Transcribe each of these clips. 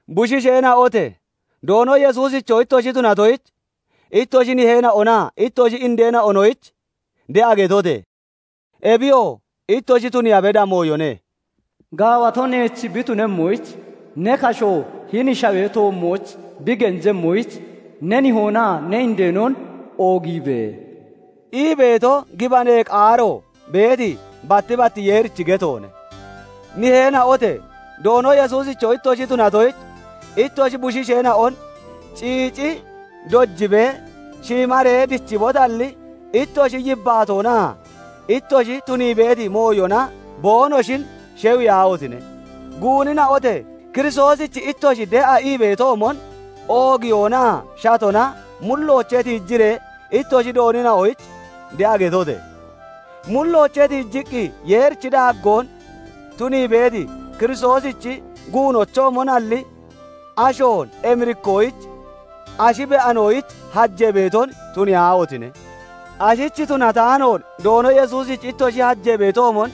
Bushiisheena'ote! Doono Yesuusicho ittoshi tunatoyich, ittoshi niheena'onaa ittoshi indeena'onoyich de'a getote! Ebiyoo ittoshi tuniiya beda mooyone. "Gaawato neech bi tunemmoyich, ne kashoo hini shawee toommooch bi genjemmoyich, ne nihoonaa ne indeenon oogiibe!" ii beeto gibanee qaaro beeti batti batti Yeerichi getoone. Niheena'ote! Doono Yesuusicho ittoshi tunatoyich, ittoshi bushiisheena'on ciici dojibee shiimaree dichibotalli, ittoshi yibbaatoonaa ittoshi tunii beeti mooyona boonoshin shewiyaahotine! Guunina'ote! Kiristoosich ittoshi de'a ii beetoomon oogiyoonaa shatona mulloochee tiijiree ittoshi doonina'oyich de'a getote! Mulloochee tiijiqqi Yeerichi daaggoon tunii beeti Kiristoosichi guunochoomonalli, ashoon emirikkoyich ashi be'anoyich hajee beeton tuniyaahotine! Ashich tunataanoon Doono Yesuusich ittoshi hajee beetoomon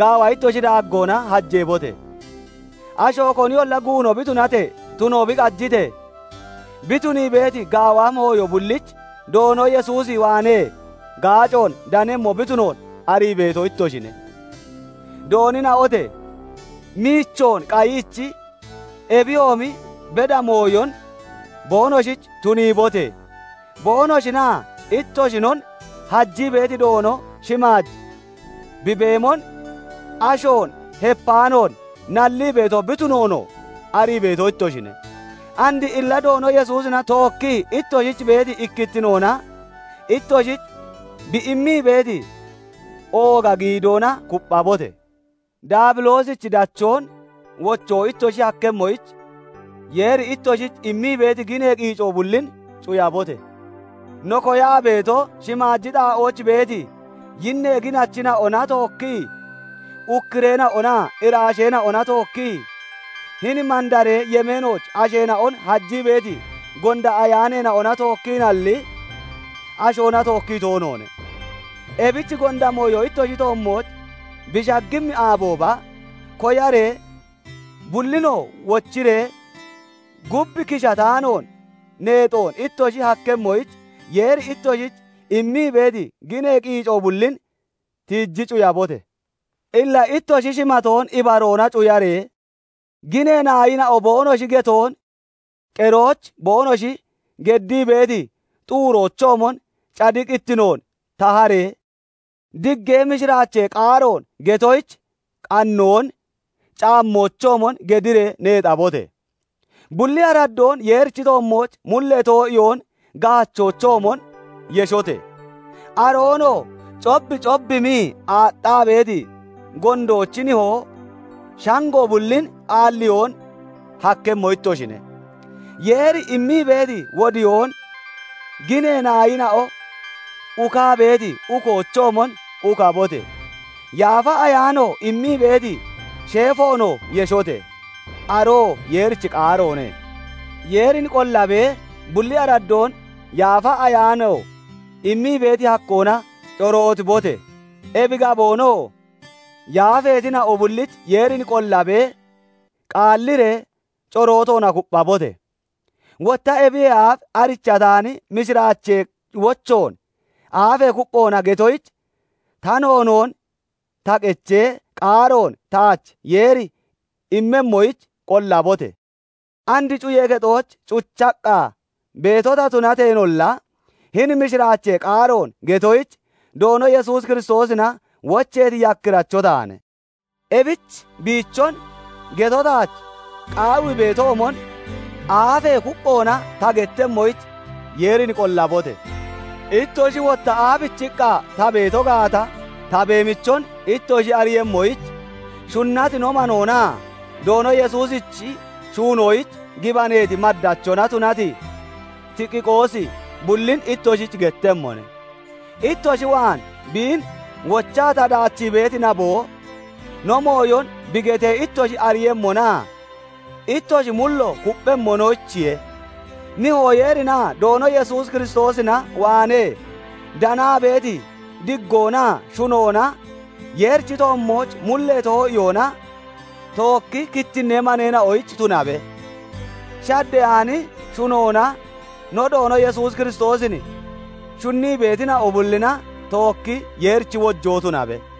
gaawa ittoshi daaggoona hajeebote! Asho koniyolla guuno bi tunatee, tuno bi qajitee, bi tunii beeti gaawa mooyo bullich Doono Yesuus waanee gaacoon danemmo bi tunoon arii beeto ittoshine. Doonina'ote! Miichoon qayiichi, ebiyoomi beda mooyon boonoshich tuniibote! Boonoshinaa ittoshinon hajii beeti Doono shimaaj bi beemon, ashoon hepaanoon nallii beeto bi tunoonoo arii beeto ittoshine. And illa Doono Yesuusina tookkii ittoshich beeti ikkittinoona ittoshich bi immii beeti ooga giidoona kupphabote! Daabiloosichi dachoon wochoo ittoshi hakkemmoyich, Yeeri ittoshich immii beeti ginee qiico bullin cuyabote! No koyaa beeto, shimaaji xaa'ooch beeti yinnee ginachina'ona tookkii, ukkureena'onaa iraasheena'ona tookkii, hini mandaree yemeenooch asheena'on hajii beeti gonda ayaaneena'ona tookkiinalli, ashoona tookkii toonoone; ebich gonda mooyo ittoshi toommooch bi shaggimmi aabooba, koyaree bullinoo wochiree, gub kishataanoon neexoon ittoshi hakkemmoyich, Yeeri ittoshich immii beeti ginee qiico bullin tiiji cuyabote! Illa ittoshi shimatoon ibaroona cuyaree, ginee naayina'o boonoshi getoon qeroyich boonoshi geddii beeti xuuroochoomon cadiqittinoon taharee, diggee mishiraachee qaaroon getoyich qannoon caammoochoomon gediree neexabote! Bulli araddoon Yeerichi toommooch mullee too'iyoon gaachoochoomon yeshote! Aroonoo cobcobbimii aaxxaa beeti gondoochi nihoo shango bullin aalliyoon hakkemmo ittoshine. Yeeri immii beeti wodiyoon ginee naayina'o ukaa beeti ukoochoomon ukabote! Yaafa Ayaano immii beeti sheefoonoo yeshote! Aroo Yeerichi qaaroone. Yeerin qollabee bulli araddoon Yaafa Ayaano immii beeti hakkoona corootibote! Ebi gaboonoo yaafeetina'o bullich Yeerin qollabee qaalliree corootoona kupphabote! Wotta ebiyee aaf arichataani mishiraachee wochoon aafee kupphoona getoyich ta noonoon ta qechee, qaaroon taach Yeeri immemmoyich qollabote! And cuyee kexooch cuchaqqa beeto ta tunateenolla, hini mishiraachee qaaroon getoyich Doono Yesuus Kiristoosina wocheeti yakkiracho taane; ebich biichon geto taach qaawii beetoomon aafee kupphoona ta gettemmoyich Yeerin qollabote! Ittoshi wotta aabichiqqa ta beeto gaata ta beemichon ittoshi ariiyemmoyich, shunnati no manoonaa Doono Yesuusichi shuunoyich gibaneeti maddachona tunati Tikiqoosi bullin ittoshich gettemmone; ittoshi waan biin wochaa ta daachii beeti naboo, no mooyon bi getee ittoshi ariiyemmonaa ittoshi mullo kupphemmonoyichiye. Nihoo Yeerinaa Doono Yesuus Kiristoosina waanee danaa beeti diggoonaa shunoona, Yeerichi toommooch mullee too'iyoona tookki kittinnee maneena'oyich tunabe; shaddeyaani shunoona no Doono Yesuus Kiristoosin shunnii beetina'o bullina tookki Yeerichi wojoo tunabe.